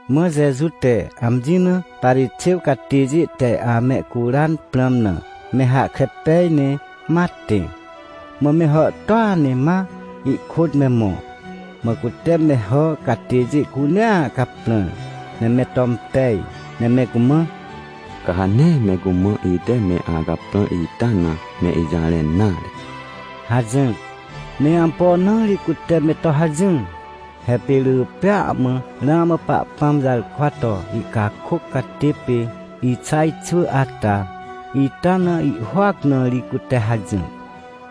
Mã Jeju te amji na Parixêw catêjê te amehcuran prãm na me hahkre pej, ne ma tẽ. Mã me hàhtôa ne ma ihkôt me mõ. Mã cute me hà catêjê cunea caprãr, ne me to impej, ne me cumã: — Ca ha nee me cumã ite me acaprãr ita na me ijarẽn nare — hajỹr. Ne ampo na ri cute me to hajỹr? He pê rỳ pêa mã ramã Pahpãm jarkwa to ihcakôc catê pê Ixaj xwỳ ata, ita na ihhôac na ri cute hajỹr.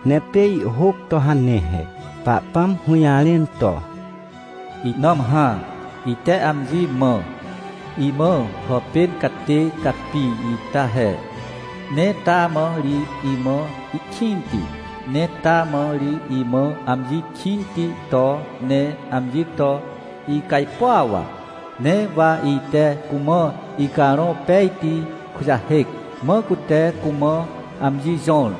Ne pê ihhôc to hane he. Pahpãm hũjarẽn to: “Ihnãm hã, ite amji mã imã hàpên catê capi ita he. Ne taa mã ri imã ihkĩnti. Ne taa mã ri imã amji kĩnti to ne amji to icajpuaw. Ne wa ite cumã Icarõ Pejti kujahêc, mã cute cumã amji jõr,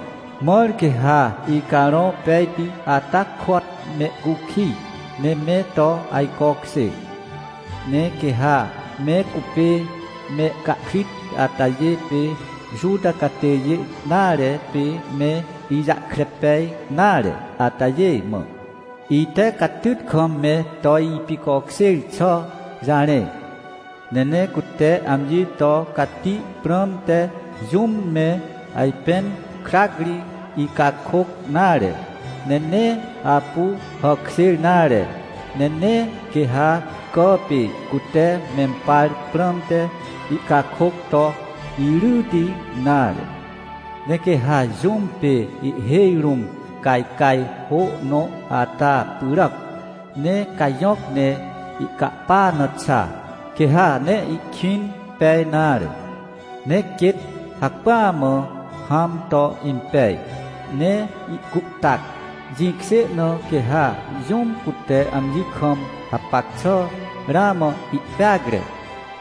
mãr quê ha Icarõ Pejti ata kôat mehcukij, ne me to ajcokjê. Ne quê ha me cupê mehcahkrit atajê pê Juta catêjê nare pê me ijahkre pej nare atajê mã, ite catyt kam me to ipicokjêr xà jarẽ. Ne nee cute amji to cati prãmte jũm me ajpẽn krac ri ihcakôc nare, ne nee apu hàkjêr nare, ne nee quê ha cà pê cute mempar prãmte ihcakôc to iryti nare. Ne quê ha jũm pê ihhêj rũm cajcaj hô nõ ata pyràc, ne cajõc ne ihcapa na xa, quê ha nee ihkwĩn pej nare, ne quêt hacpỹa mã hãm to impej, ne ihcuhtac. Jĩkjê na, quê ha jũm, cute amji kam hapac xà ramã ihpeacre,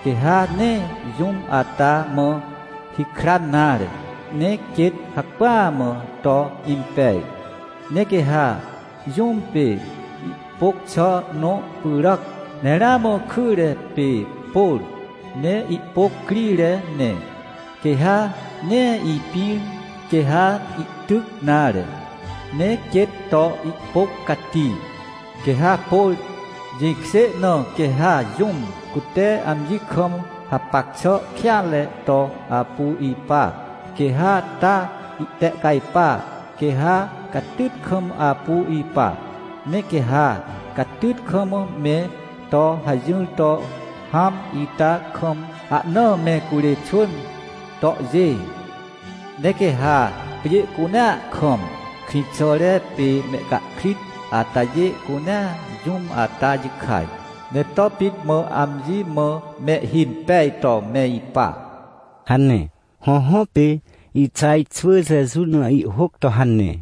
quê ha nee jũm ata mã hikran nare, ne quêt hacpỹa mã to impej. Ne quê ha jũm pê ihpôc xà nõ pyràac, ne ramã kyre pê pôr ne ihpôc crire ne, quê ha nee ipĩr quê ha ihtyc nare, ne quêt to ihpôc cati, quê ha pôr. Jĩkjê na, quê ha jũm, cute amji kam hapac xà kêanre to apu ipa, quê ha taa ihtehcajpa, quê ha catyt kam apu ipa. Ne quê ha catyt kam me to hajỹr to hãm ita kam, ahnaa me curê xwỳn tohjê. Ne quê ha pjê cunea kam, krĩxàre pê mehcahkrit atajê cunea jũm ata jikaj, ne to pit mã amji mã mehhimpej to me ipa” hane. Hõhõ, pê Ixaj xwỳ Jeju na ihhôc to hane.